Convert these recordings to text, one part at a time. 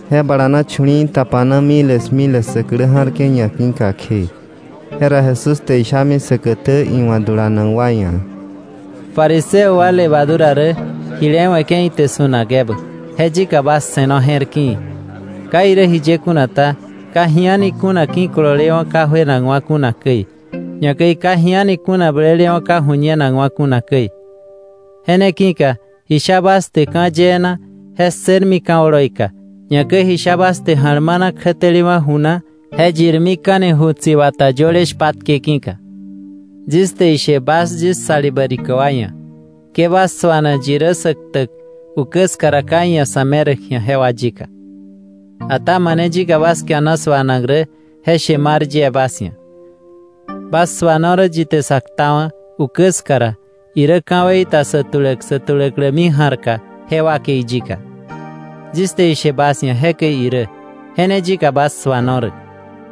Je bala na chu̱li̱i̱ tapana miles miles sä klä ja̱rke̱ ñaki̱ka kje, jera Jesús te ishami säkätä iwa̱ dulanak wa ia̱: “Fariseo wa levadura rä jile we̱ke̱ ite su̱nak ebä, je yika bas se̱no je̱r ki̱i̱. Ka irä jiye kuna ta, ka ji a̱ni kuna ki̱kololewa̱ ka juenakwa̱ kuna käi. Ñakäi ka ji a̱ni kuna blelewa̱ ka ju̱ñenakwa̱ kuna käi. Je ne ki̱ka ji sha bas te ka̱ yee na, je ssërmi ka̱ oloika, ñakäi ji sha bas te ja̱lmana kjätelewa̱ ju na, je yirmika̱ni ju tsi̱bata yöle shpatke ki̱ka. “Yis te ishe bas yis salibä rikä wa ia̱; ke bas suana yi rä sä ktäk ukä ska ka iia̱ sa̱ meräk ji̱a jewa yika. Ata mane yika bas kiana suanak rä, je she mar yie bas ia̱: Bas suano rä yi te sa ktawa̱ ukä ska ra, irä ka̱wei ta sä tuläk sä tuläklämi ja̱rka je wakei yika. Yis te ishe bas ia̱ jekäi irä, je ne yika bas suano rä.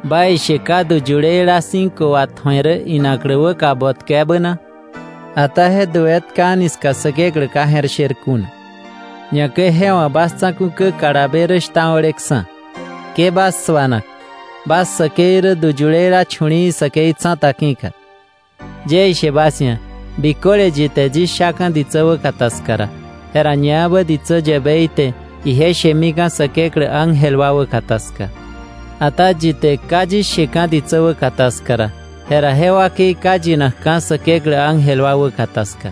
“¿Baishe ka du yuleila cinco watju̱e rä inaklä wäka botkä ebä na? Ata je du etka a̱ni ska Säkeklä ka je̱r sher kuna, ñakäi je wa̱ bas tsa̱ku̱ kä kalabe rä shtao̱leksa̱. Ke bas suana. Bas säkei rä du yuleila chu̱li̱i̱ säkei tsa̱ta ki̱ka. “Yie ishe bas ia̱, biköle yi te yis shaka̱ ditsä wäkata ska ra, jera ñaebä ditsä yäbei te ije shemika̱ Säkeklä ángel wa wäkata ska. Ata yi te ka yis sheka̱ ditsä wäkata ska ra, jera je wakei ka yinakka̱ Säkeklä ángel wa wäkata ska.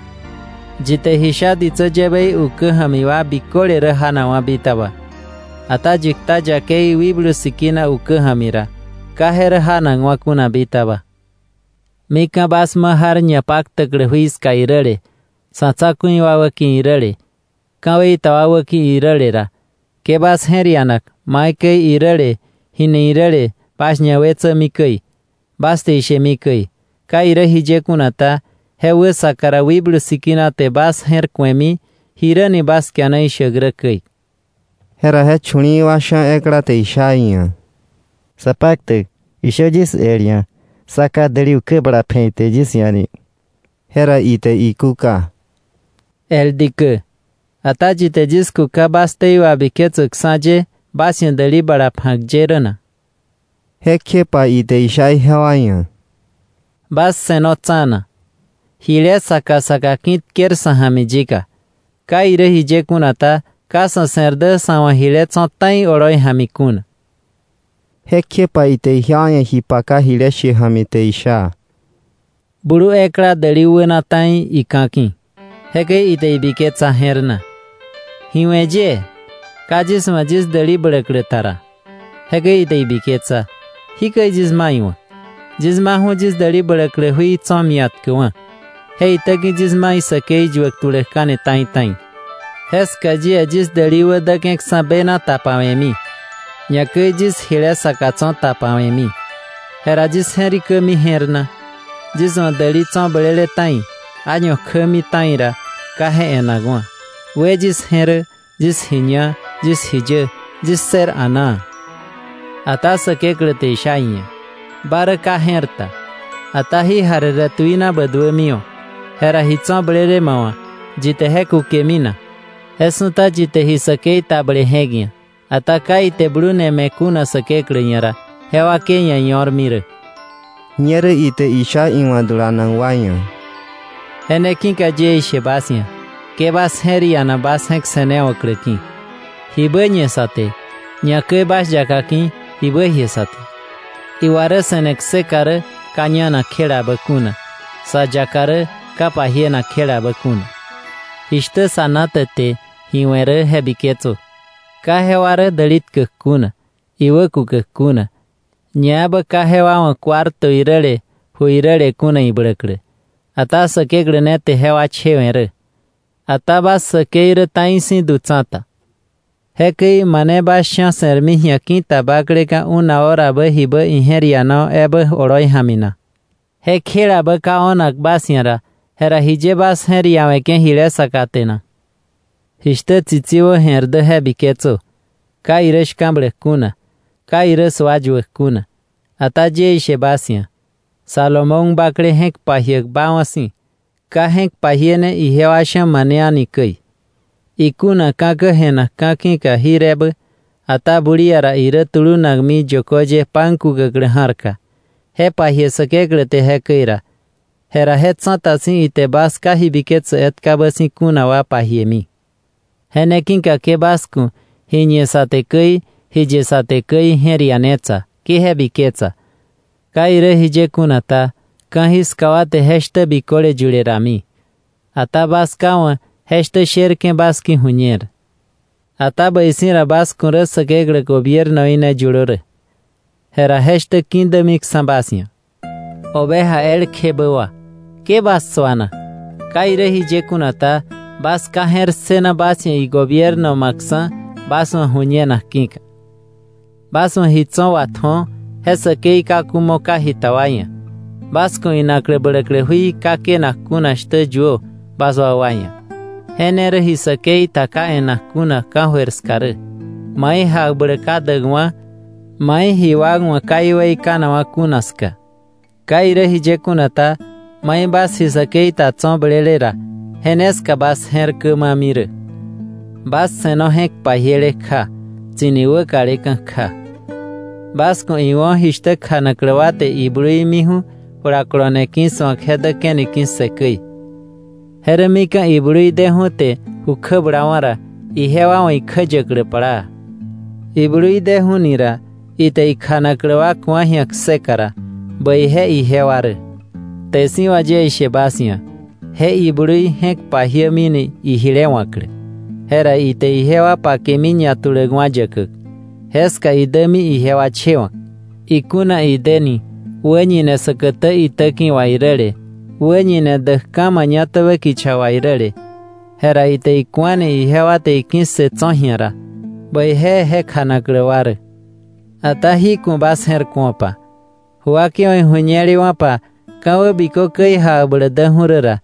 “Yi te ji sha ditsä yäbei ukä ja̱mi wa biköle rä janakwa̱ bitaba. Ata yi kta yakei Wikblu Sikina ukä ja̱mi ra, ka je rä janakwa̱ kuna bitaba. “Mika̱ bas ma jar ñapaktäklä jui ska iräle, sa̱ tsa̱ku̱i wa wäki̱ iräle, ka̱wei ta wa wäki̱ iräle ra, ke bas je̱r ianak maikäi iräle jini iräle bas ñawetsämi käi, bas te ishemi käi. Ka irä jiye kuna ta, je wäsaka ra Wikblu Sikina te bas je̱r ku̱emi jiräni bas kiana ishäk rä käi.” Jera je chu̱li̱i̱ wa sha̱ ekla te isha iia̱: —Sapaktäk, ishö yis el ia̱, sá ká däli ukä bala pje̱ ite yis ia̱ ni. Jera ite ikúka: —El dikä, ata ¿yi te yis kuka bas ktei wabiketsäkksa̱ ye bas ia̱ däli bala pja̱k ye rä na? Jekjepa ite isha ijewa ia̱: —Bas se̱no tsa̱na, jile saka saka ki̱ tker sa̱ ja̱mi yika. Ka irä jiye kuna ta, ka sa̱ se̱r dä sa̱ wa̱ jile tso̱ ta̱i oloi ja̱mi kuna. Jekjepa ite ijewa ia̱ ji paka jile she ja̱mi te isha: “Blu ekla däli wäna ta̱i ika̱ ki̱. Jekäi ite ibiketsa je̱r na: ‘¿Ji we̱ yie? Ka yis wa̱ yis däli bläklä ta ra.’ Jekäi ite ibiketsa: ‘Jikäi yis ma iwa̱k. Yis ma yis däli bläklä jui tso̱ mia̱tkäkwa̱, je itäki̱ yis ma isäkei yuäk tuläkka̱ni ta̱i ta̱i. Jeska yie yis däli wä deke̱ksa̱ bena tapawe̱mi, ñakäi yis jile saka tso̱ tapawe̱mi.’ Jera yis je̱rikämi je̱r na: ‘Yis wa̱ däli blele tso̱ ta̱i, año kjämi ta̱i ra ka je e̱nakwa̱. We yis je̱ rä, yis ji ña, yis ji yä, yis ssër a̱naa.’ Ata Säkeklä te isha iia̱: ‘Ba rä ka je̱r ta. Ata ji jarere tuina bä duämiwa̱. Jera ji tso̱ blele ma wa̱, ¿yi te je kukemi na?’ Je su̱ta yi te ji säkei ta ble je̱k ia̱, ata ka ite blune me̱ Säkeklä ia̱ kuna ra, je wakei ia̱ io̱rmi rä.” Ñerä ite isha iwa̱ dulanak wa ia̱: “Je ne ki̱ka yie ishe bas ia̱: Ke bas je̱r iana bas je̱k se̱newa̱klä ki̱, jibä ñe sä te, ñakäi bas yaka ki̱, jibä jie sä te. Iwa rä se̱ne kseka rä ka ñanak kjelabä kuna; sa yaka rä ka pajienak kjelabä kuna. Jishtä zanate te ji we̱ rä je biketsö. Ka jewa rä däli tkäk kuna, iwä kukäk kuna; ñaebä ka jewa wa̱ cuarto iräle ju iräle kuna ibläklä. Ata Säkeklä ne te jewa chewe̱ rä. Ata bas säkei rä ta̱i si̱ du tsa̱ta. Jekäi ¿mane bas sha̱ se̱rmi ji̱a ki̱ta bakleka̱ una horabä jibä ije̱r ianawa̱ ebä oloi ja̱mi na? Je kjelabä ka o̱nak bas ia̱ ra, jera jiye bas je̱r iawe̱ke̱ jile saka te na? “Jishtä tsitsi wä jè̱r dä je biketsö. Ka irä shka̱bläk kuna, ka irä sua yuäk kuna. Ata yie ishe bas ia̱, Salomón bakle je̱k pajiäk baawa̱ si̱, ka je̱k pajiene ijewa sha̱ mane a̱ni käi. Ikuna ka̱kä je̱nak ka̱ ki̱ka jir ebä, ata bulia ra irä tulunakmi yökö ye pan kukäklä ja̱rka, je pajie Säkeklä te jekäi ra, jera je tsa̱ta si̱ ite bas ka ji biketsäk etkabä si̱ kuna wa pajiemi. Je ne ki̱ka ke bas ku̱ ji ñe sa te käi, ji ye sa te käi je̱r ianetsa, ke je biketsa. ¿Ka irä jiye kuna ta, ka̱jiska wa te je shtä biköle yule rami, ata bas Ká wa̱ je shtä sherke̱ bas ki̱ ju̱ñer. “Ata bäi si̱ ra bas ku̱ rä Säkeklä gobiernoí ne yulö rä, jera je shtä ki̱dämiksa̱ bas ia̱. “Oveja elkjebä wa, ke bas suana. Ka irä jiye kuna ta, bas Ká je̱r ssëna bas ia̱ igobierno ma̱ksa̱ bas wa̱ ju̱ñenak ki̱ka. Bas wa̱ ji tso̱ watju̱o, je säkei kaku mo ka jita wa ia̱. Bas ku̱ inaklä bläklä jui ka kënak kuna shtä yuö bas wakwa ia̱. Je ne rä ji säkei ta ka e̱nak kuna ka̱jöir ska rä, mai jakbläk ka däkwa̱, mai ji wak wa̱ ka iweikanakwa̱ kuna ska. Ka irä jiye kuna ta, mai bas ji säkei ta tso̱ blele ra, je ne ska bas je̱r kämami rä. “Bas se̱no je̱k pajiele kja tsi̱ni wäkaleka̱ kja. Bas ku̱ iwo̱ jishtä kjanaklä wa te iblui miju̱ julakolone ki̱su̱ak je däke̱ni ki̱ssë käi. Je rä mika̱ iblui deju̱ te ju kjä bulawa̱ ra, ijewa wa̱ ikjäyäklä plaa. Iblui deju̱ni ra ite ikjanaklä wa ku̱a ji̱a kseka ra, bäije ijewa rä. Kte si̱ wà yie ishe bas ia̱, je iblui je̱k pajiämini ijile wa̱klä. Jera ite ijewa pakemi ñatuläkwa̱ yäkäk, jeska idämi ijewa chewa̱k. Ikuna ideni wäñine säkätä itäki̱ wà iräle, wäñine däkka̱ mañatäbä kicha wà iräle, jera ite iku̱ani ijewa te iki̱ssë tso̱ ji̱a ra, bäije je kjanaklä wa rä. Ata jí ku̱ bas je̱r ku̱opa, ju wakeiwa̱ ijuñelewa̱pa ka̱wä bikö käi jakbläk däju̱ rä ra,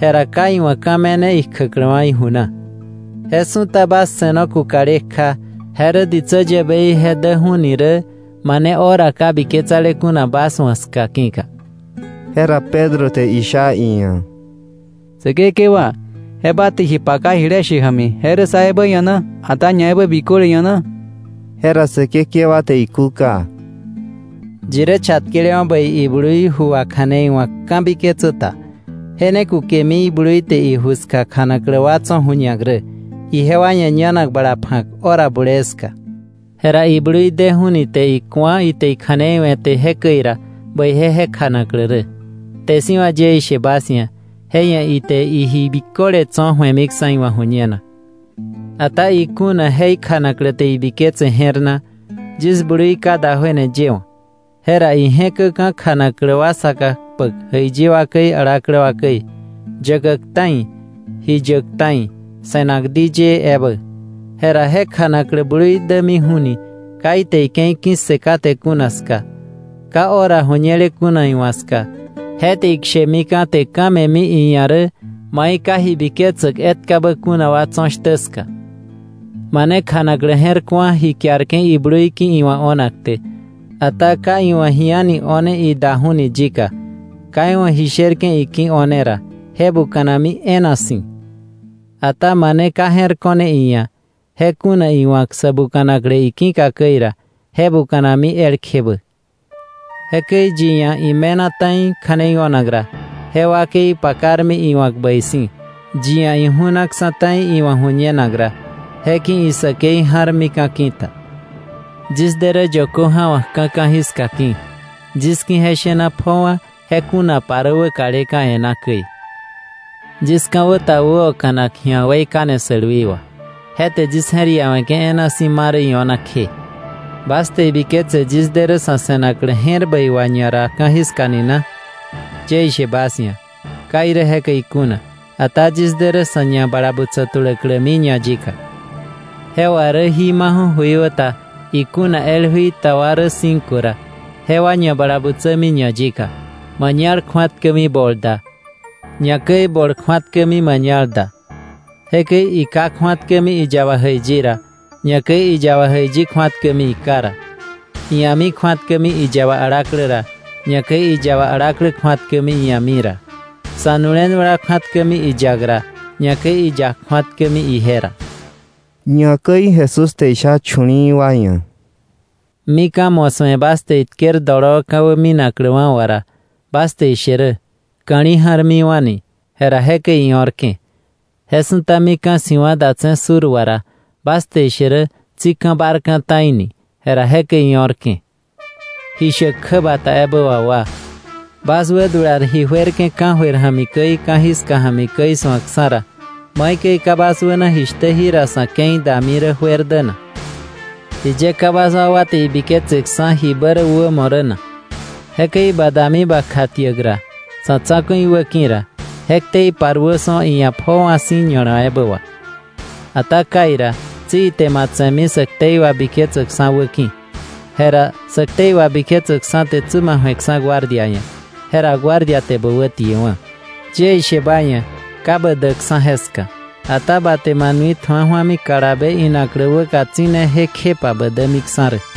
jera ka iwa̱ ka̱ me̱ne ikjäkläwa̱ iju na. Je su̱ta bas se̱no kukale kja, je rä ditsä yäbei je däju̱ni rä mane hora ka biketsale kuna bas wa̱ ska ki̱ka.” Jera Pedro te isha iia̱: —Säkekewa, ¿je ba te ji paka jile she ja̱mi, je rä sá ebä ia̱ na, ata ñaebä biköle ia̱ na? Jera Säkekewa te ikúka: “¿Yi rä chatkelewa̱ bäi iblui ju kja̱nei wa̱k ka̱biketsä ta, kolonakta̱na iblui wa̱ iju ska kjanaklä wa tso̱ ju̱ñak, ijewa ia̱ ñanak bala pja̱k hora bulee ska rä na? Jera iblui deju̱ni te iku̱a ite ikja̱nei we̱te jekäi ra, bäije je kjanaklä rä. Kte si̱ wà yie ishe bas ia̱, je ia̱ ite iji biköle tso̱ ju̱emiksa̱ iwa̱ ju̱ñenak. Ata ikuna je ikjanaklä te ibiketse je̱r na: ‘Yis blui ka da juena yewa̱’, jera ije̱käka̱ kjanaklä wa saka kpäk jäiyi wa käi alaklä wa käi, yäkäk ta̱i, ji yäk ta̱i, se̱nak diyëë ebä, jera je kjanaklä blui dämiju̱ni ka ite ike̱i ki̱ssë kate kuna ska, ka hora ju̱ñele kuna iwa̱ ska, je te ikshe̱mika̱ te ka̱ me̱mi iia̱ rä mai ka ji biketsäk etkabä kuna wa tso̱ shtä ska. “Mane kjanaklä je̱r ku̱a ji kiarke̱ iblui ki̱ iwa̱ o̱nak te, ata ka iwa̱ ji a̱ni o̱ne idaju̱ni yika, ka iwa̱ ji sherke̱ iki̱ o̱ne ra, je buka̱nami e̱e̱na si̱. Ata mane ka je̱r ko̱ne iia̱, je kuna iwa̱k sä buka̱naklä iki̱ka käi ra, je buka̱nami elkjebä. Jekäi yi ia̱ ime̱na ta̱i kja̱nei o̱nak ra, je wakei pakarmi iwa̱k bäi si̱. Yi ia̱ iju̱naksa̱ ta̱i iwa̱ ju̱ñenak ra, je ki̱ isäkei ja̱rmika̱ ki̱ta. “Yis de rä yökö ja̱wa̱kka̱ ka̱jiska ki̱. Yis ki̱ je shena pjowa̱ je kunapa rä wäkaleka̱ e̱ná käi. Yis ka̱wä ta wäoka̱nak ji̱a weikane sälwi wà, je te yis je̱r iawe̱ke̱ e̱e̱na si̱ ma rä io̱na kje. “¿Bas te ibiketse yis de rä sa̱ se̱naklä je̱r bäi wà ñara ka̱jiska ni na? Yie ishe bas ia̱, ka irä jekäi kuna. Ata yis de rä sa̱ ñabalabutsä tuläklämi ñayika. Je wà rä jí maju̱ jöikwä ta ikuna el jui ta wa rä cinco ra, jewa ñabalabutsämi ñayika. Mañal kju̱atkämi bol da, ñakäi bol kju̱atkämi mañal da. Jekäi iká kju̱atkämi iyaba jäiyi ra, ñakäi iyaba jäiyi kju̱atkämi iká ra. Ia̱mi kju̱atkämi iyaba alaklä ra, ñakäi iyaba alaklä kju̱atkämi ia̱mi ra. Sa̱nu̱le nu̱lewa kju̱atkämi iyak ra, ñakäi iyak kju̱atkämi ije ra.” Ñakäi Jesús te isha chu̱li̱i̱ wa ia̱: “Mika̱ mo̱ su̱e bas te itker doloo ka̱wä minakläwa̱ wà ra, bas te ishe rä, ‘ka̱li̱ ja̱rmiwa̱’ ni. Jera jekäi io̱rke̱. Je su̱ta mika̱ si̱wa̱ datse̱ sur wà ra, bas te ishe rä, ‘tsi ka̱ bárka̱ ta̱i ni.’ Jera jekäi io̱rke̱. ¡Ji shäk kjäbata ebä wà wa! Bas wädular ji juerke̱ ka̱jöir ja̱mi käi, ka̱jiska ja̱mi käi su̱akksa̱ ra, ¿maikäi ka bas wäna jishtä jira sa̱ ke̱i dami rä juer dä na? “¿Jiye ka bas wakwa te ibiketseksa̱ jibä rä wämo rä na? Jekäi ba dami ba kjatiäk ra sa̱ tsa̱ku̱i wä ki̱ ra, je ktei paruö su̱o iia̱ pjoowa̱ si̱ ña̱la ebä wà. Ata kai ra, tsi ite ma tse̱mi sä ktei wabiketsäkksa̱ wä ki̱ka, jera sä ktei wabiketsäkksa̱ te bä ju̱eksa̱ guardia ia̱, jera guardia te bä wätiewa̱. Yie ishe ba ia̱, ka bä däkksa̱ jeska, ata ba te ma nui tju̱a ju̱ami kalabe inaklä wäka tsi̱neje kjepa bä dämiksa̱ rä.”